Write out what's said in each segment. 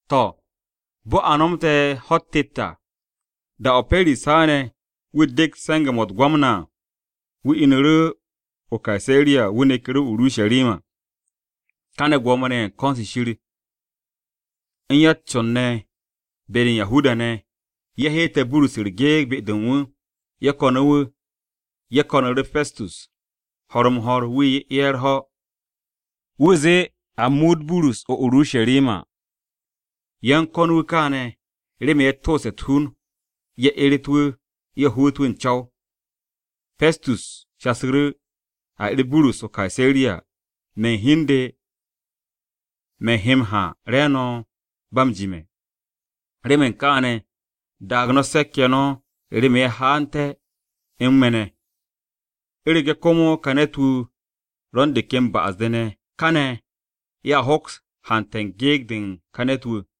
To̱, bo̱ a nomte̱ ho̱-u̱t tet à, da-o̱ Pestus haane̱ wu̱ dekt se̱nge̱-mo̱ u̱t-Gwamna à, wu̱ inu̱ru̱ o-Kaseriya wu̱ neku̱ru̱ o-Urusharima. Kaane̱ Gwo̱mo-ne̱ ye̱ u̱n ko̱n-se Shir u̱n ya-u̱t-con-ne̱ be-de u̱n Yahuda-ne̱, ye̱ heetu̱ Burus u̱s-gyekt be-de u̱n wu̱. Ye̱ ko̱nu̱ wu̱. Ye̱ ko̱nu̱ru̱ Pestus ho̱r-m-ho̱r wu̱ 'ye ye̱ u̱r-ho̱, wu̱ zee a muut Burus o-Urusharima. Ye̱ u̱n ko̱n wu̱ káane̱ remen ye̱ tooste̱ u̱t-hun, ye̱ eret wu̱, ye̱ hoot wu̱ u̱n co̱w. Pestus shasu̱ru̱, “A 'er Burus o-Kaseriya, me̱ u̱n hi u̱n de me̱ he m-ha re̱e̱no̱ ba m-jime̱. Remen kaane̱ daag no̱ se̱k-ye̱ no̱ remen ye̱ haanté̱ u̱n me̱ ne̱. U̱rege̱ komo ka ne̱t-wu̱ ro̱ u̱n de ken ba'as-de ne̱, káne̱ ye̱a hoks hante̱ gyekt-se u̱n ka ne̱t-wu̱.”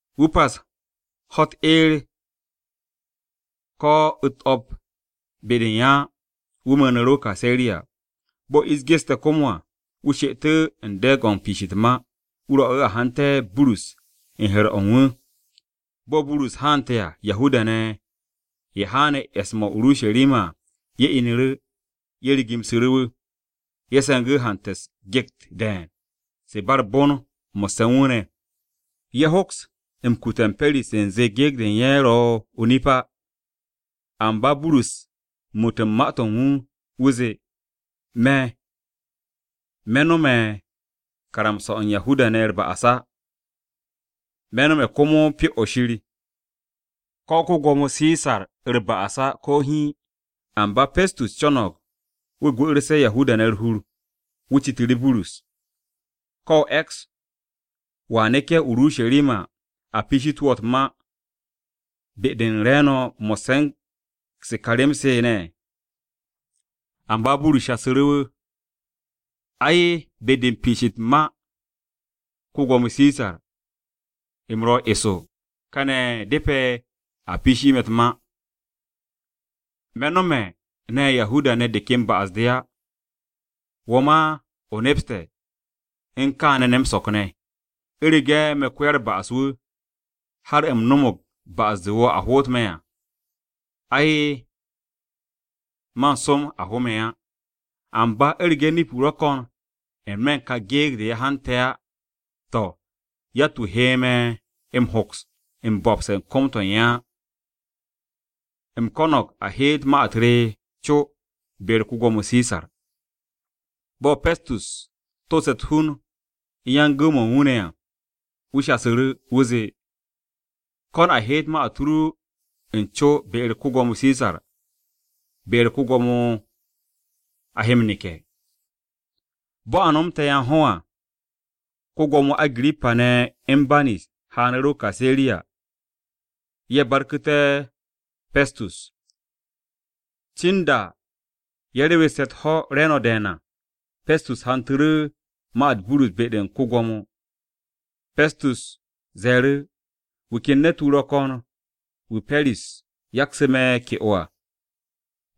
Wu̱ pas ho̱-u̱t eer ko̱ u̱t-o̱p be-de u̱n ye̱ á, wu̱ mu̱u̱nu̱ru̱ o-Kaseriya. Bo̱ ish geste̱ komo à, wu̱ she'etu̱ u̱n de̱e̱g-o̱ u̱n piish u̱t-ma, wu̱ rwo̱'u̱ a hante̱ Burus u̱n he̱r-o̱ u̱n wu̱. Bo̱ Burus haante̱ à, Yahuda-ne̱ ye̱ haane̱ e̱s-mo̱ o-Urusharima à, ye̱ inu̱ru̱, ye̱ rigimsu̱ru̱ wu̱. Ye̱ se̱ngu̱ hante̱ u̱s-gyekt de̱e̱n, se ba u̱r-bon mo̱sse̱ u̱n wu̱ ne̱. Ye̱ hoks m-kute̱ Pestus u̱nze gyekt-se u̱n ye̱ se o-nip se á. Amba Burus u̱n muut u̱n ma-to̱ wu̱, wu̱ zee “Me̱, me̱ nome̱ karamsa-o̱ u̱n Yahuda-ne̱ u̱r-ba'as á, me̱ no̱me̱ komo Pyo-o̱ Shir, ko̱ ko-Gwo̱mo Sisaru̱r-ba'as á ko̱ hiin.” Amba Pestus co̱no̱g wu̱ gwu̱'u̱rse̱ Yahuda-ne̱ u̱r-hur, wu̱ citu̱ru̱ Burus, “¿Ko̱ o e̱ks wo̱a neke̱ o-Urusharima a piishitu̱ wo̱ u̱t-ma re̱e̱no̱ mo̱sse̱ u̱n se ka rem-se ne̱?” Amba Burus shasu̱ru̱, “Ai, be-de u̱n piish u̱n ma-u̱t ko-Gwo̱mo Sisar, u̱m ro̱ eso, kane̱ depe̱ a piishi me̱ u̱t-ma. Me̱ nome̱ ne̱ Yahuda-ne̱ de ken ba'as-de á, wo̱ ma, o nepste̱ u̱n kaane̱ ne̱ m-so̱k ne̱. U̱rege̱ me̱ ko-ya-u̱r-ba'as-wu̱, har u̱m no̱mo̱g ba'as-de wo̱o̱ a hoot me̱ à, ay, man som a ho me̱ á. Amba u̱rege̱ nip-o ro̱ ko̱n n-me̱ u̱n ka gyekt-se ye̱ m-hante̱ à, to̱, yatt-wu̱ he me̱ m-hoks m-bo̱pse̱ u̱n kom-to̱ u̱n ye̱ á. U̱m ko̱no̱g a heet ma-u̱t re co be-u̱r ko-Gwo̱mo Sisar.” Bo̱ Pestus tooste̱ u̱t-hun u̱n yan-gu̱w-mo̱ u̱n wu̱ ne̱ à, wu̱ shasu̱ru̱. Wu̱ zee, “Ko̱n a heet ma-u̱t ru u̱n co be-u̱r ko-Gwo̱mo Sisar, be-u̱r Sisar komo o he m-neke̱.” Bo̱ a nomte̱ yan-ho̱ à, ko-Gwo̱mo Agirippa ne̱ u̱n Banis haanu̱ru̱ o-Kaseriya ye̱ barku̱té̱ Pestus. Cin da ye̱a rewesse̱ u̱t-ho̱ re̱e̱no̱ de̱e̱n à, Pestus hantu̱ru̱ ma-u̱t Burus be-de u̱n ko-Gwo̱mo. Pestus ze̱e̱ru̱, “Wu̱ ken ne̱t-wu̱ ro̱ ko̱n wu̱ Pe̱ris yaksu̱ me̱ ke'o à.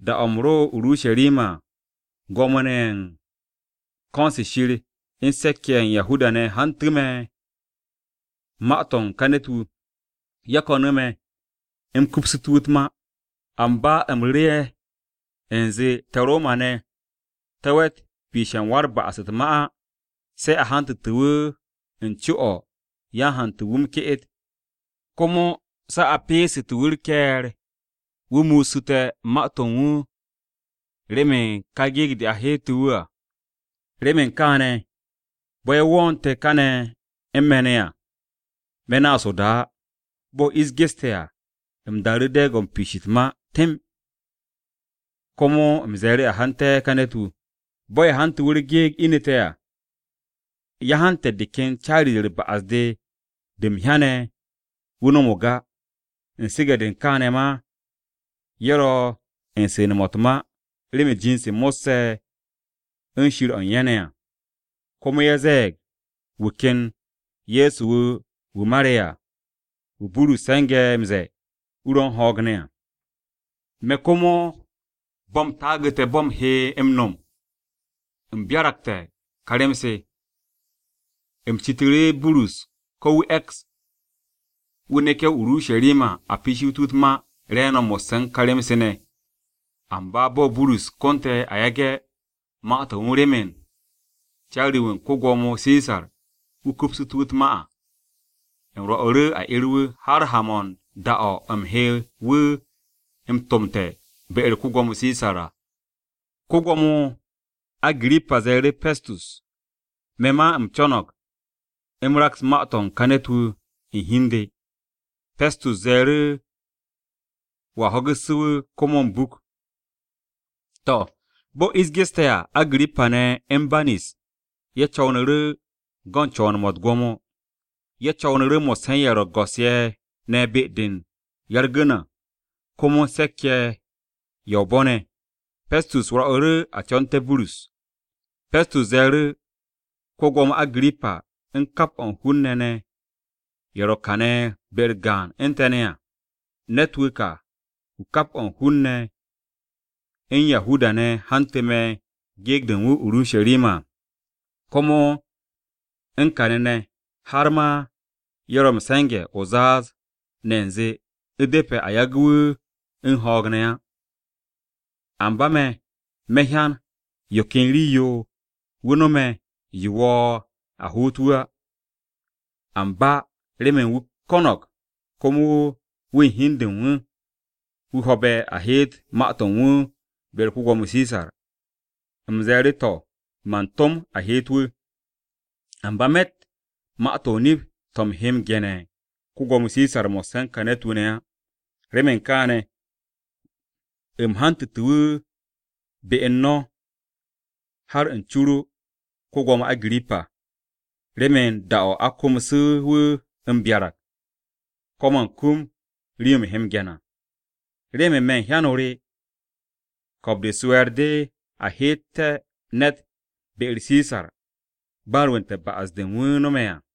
Da-o̱ u̱m ro o-Urusharima à, Gwo̱mo-ne̱ ye̱ u̱n ko̱n-se Shir u̱n se̱k-ye̱ ne̱ ye̱ u̱n Yahuda-ne̱ hantu̱ me̱ ma-to̱ u̱n ka ne̱t-wu̱. Ye̱ ko̱nu̱ me̱, u̱m kupsu̱tú̱ wu̱ u̱t-ma. “Amba u̱m ru̱ru̱tu̱ ye̱ u̱nze, te̱ Roma-ne̱ te̱ we̱t m-piishe̱ u̱n wa-u̱r-ba'as u̱t-ma á se̱ a hantu̱tu̱ wu̱ u̱n co-o̱ yan-hantu̱ u̱n wu̱ m-ke'et, komo se̱ a peesu̱tu̱ wu̱ u̱r-ke̱e̱r wu̱ muusu̱te̱ ma-to̱ u̱n wu̱ remen ka gyekt-se a heetu̱ wu̱ à. Remen kaane̱, bo̱ ye̱ wo̱o̱nte̱ kane̱ u̱n me̱ ne̱ à, me̱ naas o-da á. Bo̱ ish geste̱ à, u̱m daaru̱ de̱e̱g-o̱ u̱n piish u̱t-ma temb, komo u̱m ze̱e̱ru̱ a hante̱ ka ne̱t-wu̱. Bo̱ ye̱ hante̱ wu̱ u̱s-gyekt inite̱ à, ye̱ hante̱ de ken caari-de u̱r-ba'as de, de u̱m hyane̱ wu̱ no̱mo̱g á. U̱n su̱ge̱-de u̱n kaane̱ ma, ye̱ ro̱ u̱n su̱ne̱-mo̱ u̱t-ma remen jind-se mo̱sse̱ u̱n Shir o̱ u̱n ye̱ ne̱ à. Komo ye̱ ze̱e̱g wu̱ ken Ye̱so wu̱ wu̱ mare̱ à, wu̱ Burus se̱nge̱ m-ze̱e̱ wu̱ ro̱ u̱n ho̱o̱g ne̱ à. Me̱ komo bo̱ u̱m taagu̱te̱ bo̱ u̱m he m-no̱m u̱m byaragte̱ ka rem-se. U̱m citu̱ru̱ Burus ko̱ wu̱ e̱ks wu̱ neke̱ o-Urusharima a piishitu̱ wu̱ u̱t-ma re̱e̱no̱ mo̱sse̱ u̱n ka rem-se ne̱. Amba bo̱ Burus konte̱ a yage̱ ma-to̱ u̱n wu̱ remen caari-wu̱ u̱n ko-Gwo̱mo Sisar wu̱ kupsu̱tu̱ wu̱ u̱t-ma à. U̱m rwo̱'u̱ru̱ a 'er wu̱ har ha-mo̱ u̱n da-o̱ u̱m he wu̱ m-tomte̱ be-u̱r ko-Gwo̱mo Sisar à.” Ko-Gwo̱mo Agirippa ze̱e̱ru̱ Pestus, “Me̱ ma u̱m co̱no̱g u̱m raks ma-to̱ u̱n ka ne̱t-wu̱ u̱n hi u̱n de.” Pestus ze̱e̱ru̱, “Wo̱a ho̱gu̱ssu̱ wu̱ komo m-buk.” To̱, bo̱ ish geste̱ à, Agirippa ne̱ u̱n Banis ye̱ co̱wnu̱ru̱ go̱n co̱wo̱n-mo̱ u̱t-gwo̱mo. Ye̱ co̱wnu̱ru̱ mo̱sse̱ u̱n ye̱ ro̱ go̱s-ye̱ ne̱ be-de ya-u̱r-gu̱n à komo u̱n se̱k-ye̱ ye̱ o-bo̱ ne̱. Pestus rwo̱'u̱ru̱ a co̱nte̱ Burus. Pestus ze̱e̱ru̱, “Ko-Gwo̱mo Agirippa, u̱n kap o̱ u̱n hun-ne̱ ne̱ ye̱ ro̱ kane̱ be-u̱r gaan u̱n te̱ ne̱ à, ne̱t-wu̱ ka wu̱ kap o̱ u̱n hun-ne̱ u̱n Yahuda-ne̱ hantu̱ me̱ gyekt-se u̱n wu̱ o-Urusharima à, komo u̱n kane̱ ne̱, har ma ye̱ ro̱ m-se̱nge̱ o-zaaz ne̱ u̱nze u̱depe̱ a yagu̱ wu̱ u̱n ho̱o̱g ne̱ á. Amba me̱, me̱ hyan yo ken rii-yo wu̱ nome̱ yo wo̱o̱ a hoot wu̱ á, amba remen wu̱ ko̱no̱g komo wu̱ u̱n hi u̱n de u̱n wu̱, wu̱ ho̱be̱ a heet ma-to̱ u̱n wu̱ be-u̱r ko-Gwo̱mo Sisar, u̱m ze̱e̱ru̱ to̱ man tom a heet wu̱. Amba me̱tt ma-to̱ o-nip to̱ u̱m he ge̱ne̱ u̱n ko-Gwo̱mo Sisar mo̱sse̱ u̱n ka ne̱t-wu̱ ne̱ á. Remen kaane̱, u̱m hantu̱tu̱ wu̱ be u̱n no̱ har u̱n co-o ru, ko-Gwo̱mo Agirippa, remen da-o̱ a ko̱msu̱ wu̱ m-byarag, ko̱ man kum rii-yo u̱m he m-ge̱n à. Remen me̱ u̱n hyan-o re, ko̱o̱b-de u̱s-we̱e̱r de a heet ne̱t be-u̱r Sisar ba an rwu̱nte̱ ba'as-de wu̱ no̱me̱ à.”